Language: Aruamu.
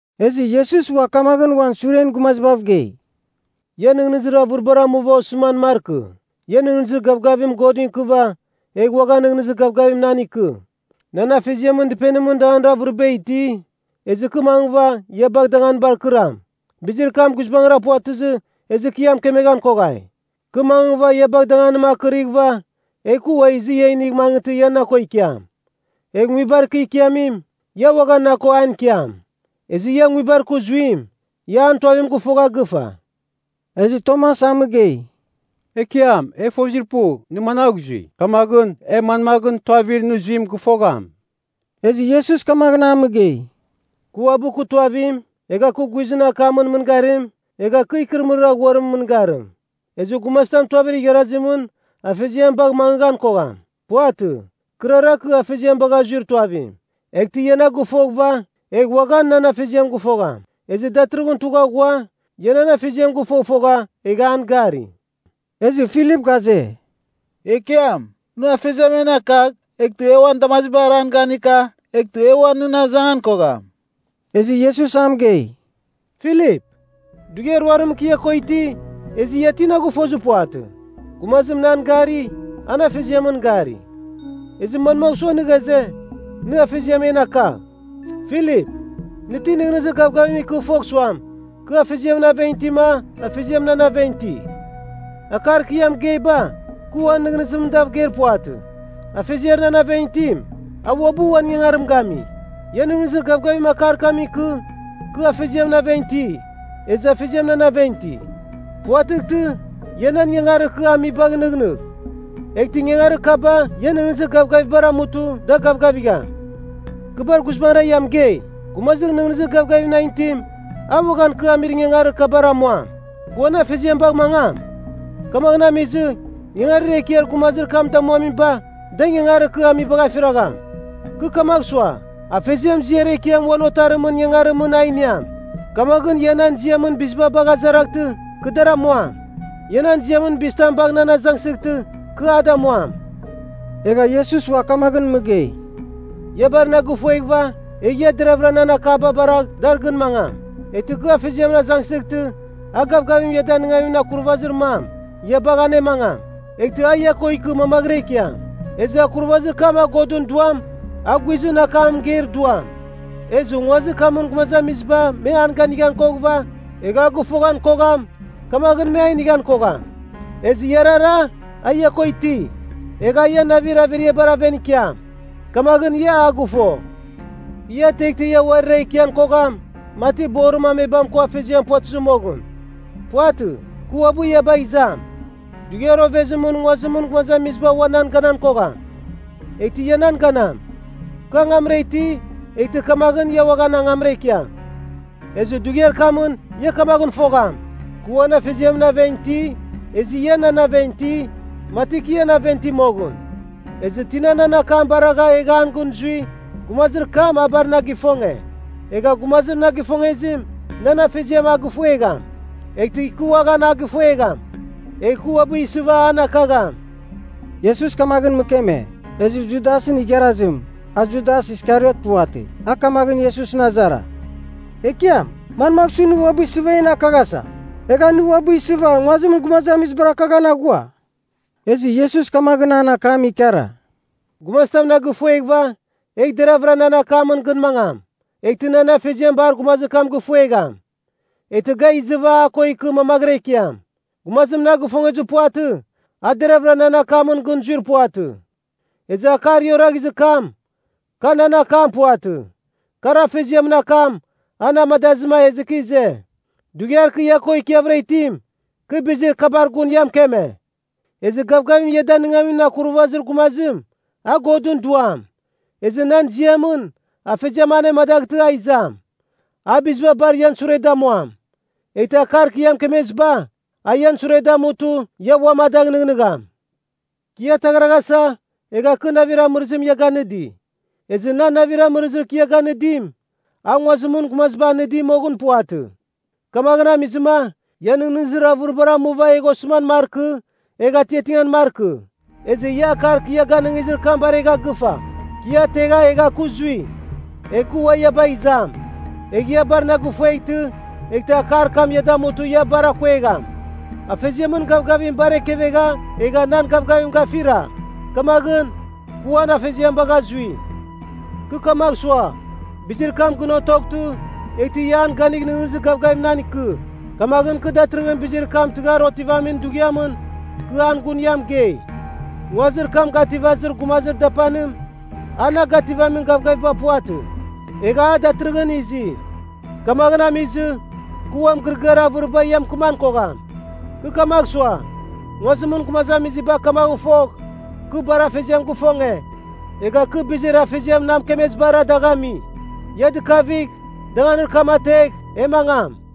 Ezɨ Iesus ua kamaghɨn uan suren gumazibav gei, “Ia nɨghnɨzir avɨribar amuva osɨman markɨ. Ia nɨghnɨzir gavgavim Godɨn ikɨva, egh uaghan nɨghnɨzir gavgavim nan ikɨ. Nan Afeziamɨn dɨpenimɨn danganir avɨriba iti, ezɨ kɨ mangɨva ia bagh danganibar kɨram. Bizir kam guizbangɨra puvatɨzɨ, ezɨ kɨ ia mɨkemeghan koghai. Kɨ mangɨva ia bagh danganim akɨrighɨva, egh ua izɨ ia inigh mangɨtɨ ia na ko ikiam. Egh nguibar kɨ ikiamim, ia uaghan na ko an ikiam. Ezɨ ia nguibar kɨ zuim, ia an tuavim gɨfogha gɨfa.” Ezɨ Tomas a mɨgei, “Ekiam, e fozir pu, nɨ managh zui, kamaghɨn e manmaghɨn tuavir nɨ zuim gɨfogham?” Ezɨ Iesus kamaghɨn a mɨgei, “Kɨ uabɨ kɨ tuavim, egha kɨ guizɨn akamɨn mɨngarim, egha kɨ ikɨrɨmɨrir aghuimɨn mɨngarim. Ezɨ gumazitam tuavir igharazimɨn Afeziam bagh mangɨgham kogham. Puvatɨ. Kɨrara kɨ Afeziam bagha zuir tuavim. Eghtɨ ia na gɨfoghɨva, egh uaghan nan Afeziam gɨfogham. Ezɨ datɨrɨghɨn tugha ghua, ia nan Afeziam gɨfofogha, egha an gari.” Ezɨ Filip ghaze, “Ekiam, nɨ Afeziam en akagh, eghtɨ e uan damazibar an ganika, eghtɨ e ua nɨn azangan kogham.” Ezɨ Iesus a mɨgei, “Filip, dughiar ruarimɨn kɨ ia ko iti, ezɨ ia ti na gɨfozir puvatɨ? Gumazim nan gari, an Afeziamɨn gari. Ezɨ manmagh sua nɨ ghaze, ‘Nɨ Afeziam en akagh’? Filip, nɨ ti nɨghnɨzir gavgavim ikɨ fogh suam, kɨ Afeziamɨn aven itima Afeziam nan aven iti? Akar kɨ ia mɨgeiba, kɨ uan nɨghnɨzimɨn dav geir puvatɨ. Afeziar nan aven itim, a uabɨ uan ingangarim gami. Ia nɨghnɨzir gavgavim akar kamɨn ikɨ, kɨ Afeziamɨn aven iti, ezɨ Afeziam nan aven iti. Puvatɨghtɨ, ia nan ingangarir kɨ amibagh nɨghnɨgh, eghtɨ ingangarir kaba ian nɨghnɨzir gavgavibar amutɨ da gavgavigham. Kɨ bar guizbangɨra ia mɨgei, gumazir nɨghnɨzir gavgavim nan itim, a uaghan kɨ amir ingangarir kabar amuam. Kɨ uan Afeziam bagh mangam, kamaghɨn amizɨ, ingangarir ekiar gumazir kam damuamiba, da ingangarir kɨ amibagh afiragham. Kɨ kamagh sua, Afeziam ziar ekiam uan Otarimɨn ingangarimɨn a iniam. Kamaghɨn ia nan ziamɨn biziba bagha azaraghtɨ, kɨ dar amuam. Ia nan ziamɨn bizitam bagh nan azangsɨghtɨ, kɨ a damuam.” Egha Iesus ua kamaghɨn mɨgei, “Ia bar na gifueghɨva, egh ia deravɨra nan akaba baragh dar gɨn mangam. Eghtɨ kɨ Afeziamɨn azangsɨghtɨ, a gavgavim ia danɨngamin Akurvazir mam ia bagh anemangam. Eghtɨ a ia ko ikɨ mamaghɨra ikiam. Ezɨ Akurvazir kam a Godɨn Duam, a guizɨn akam mɨgeir Duam. Ezɨ nguazir kamɨn gumazamiziba me an ganighan koghɨva, egh a gɨfoghan kogham, kamaghɨn me a inighan kogham. Ezɨ iarara, a ia ko iti, egh a ian navir averiabar aven ikiam. Kamaghɨn ia a gɨfo. “Kɨ ia ateghtɨ ia uarira ikian kogham, mati borim amebam ko afeziam puvatɨzɨ moghɨn. Puvatɨ. Kɨ ua ia bagh izam. Dughiar ovezimɨn nguazimɨn gumazamiziba ua nan ganan kogham. Eghtɨ ia nan ganam. Kɨ angamra iti, eghtɨ kamaghɨn ia uaghan angamra ikiam. Ezɨ dughiar kamɨn ia kamaghɨn fogham, kɨ uan Afeziamɨn aven iti, ezɨ ia nan aven iti, mati kɨ ian aven iti moghɨn. Ezɨ tina nan akam baragha egha an gɨn zui, gumazir kam a bar na gifonge. Egha gumazir na gifongezim, nan Afeziam a gifuegham. Eghtɨ kɨ uaghan a gɨfuegham, egh kɨ uabɨ isɨva an akagham.” Iesus kamaghɨn mɨkeme, ezɨ Judasɨn igharazim (a Judas Iskariot puvatɨ) a kamaghɨn Iesusɨn azara, “Ekiam, manmagh su nɨ uabɨ isɨva en akaghasa, egha nɨ uabɨ isɨva nguazimɨn gumazamizibar akaghan aghua?” Ezɨ Iesus kamaghɨn an akam ikara, “Gumazitam na gifueghɨva, egh deraghvɨra nan akamɨn gɨn mangam. Eghtɨ nan Afeziam bar gumazir kam gifuegham. Eghtɨ ga izɨva a ko ikɨ mamaghɨra ikiam. Gumazim na gifongezir puvatɨ, a deravɨra nan akamɨn gɨn zuir puvatɨ. Ezɨ akar ia oraghizir kam, ka nan akam puvatɨ. Kar Afeziamɨn akam, a na amadazɨ ezɨ kɨ ize. “Dughiar kɨ ia ko ikiavɨra itim, kɨ bizir kabar gun ia mɨkeme. Ezɨ Gavgavim ia Danɨngamin Akurvazir Gumazim, a Godɨn Duam. Ezɨ nan ziamɨn, Afeziam anemadaghtɨ a izam. A biziba bar ian sure damuam. Eghtɨ akar kɨ ia mɨkemeziba, a ian sure damutɨ ia uam a dagh nɨghnɨgham. “Kɨ ia ataghraghasa, egha kɨ navir amɨrɨzim ia ganɨdi. Ezɨ nan navir amɨrɨzir kɨ ia ganɨdim, a nguazimɨn gumaziba anɨdi moghɨn puvatɨ. Kamaghɨn amizɨma, ia nɨghnɨzir avɨribar amuva egh osɨman markɨ, egh atiatingan markɨ. Ezɨ ia akar kɨ ia ganɨngizir kam baregha gɨfa, ‘Kɨ ia ategha egha kɨ zui, egh kɨ ua ia bagh izam.’ Egh ia bar na gifueghtɨ, eghtɨ akar kam ia damutɨ ia bar akuegham. Afeziamɨn gavgavim bar ekevegha egha nan gavgavim gafira, kamaghɨn, kɨ uan Afeziam bagha zui. Kɨ kamagh sua, bizir kam gɨn otoghtɨ, eghtɨ ia an ganigh nɨghnɨzir gavgavim nan ikɨ. Kamaghɨn kɨ datɨrɨghɨn bizir kam tɨghar otivamin dughiamɨn, kɨ an gun ia mɨgei. “Nguazir kam gativazir gumazir dapanim, a na gativamin gavgaviba puvatɨ. Egha a datɨrɨghɨn izi. Kamaghɨn amizɨ, kɨ ua mɨgɨrɨgɨar avɨriba ia mɨkɨman kogham. Kɨ kamagh sua, nguazimɨn gumazamiziba kamaghɨn fogh, kɨ bar Afeziam gifonge, egha kɨ bizir Afeziam na mɨkemezibara dagh ami. Ia dɨkavigh, danganir kam ategh, e mangam.”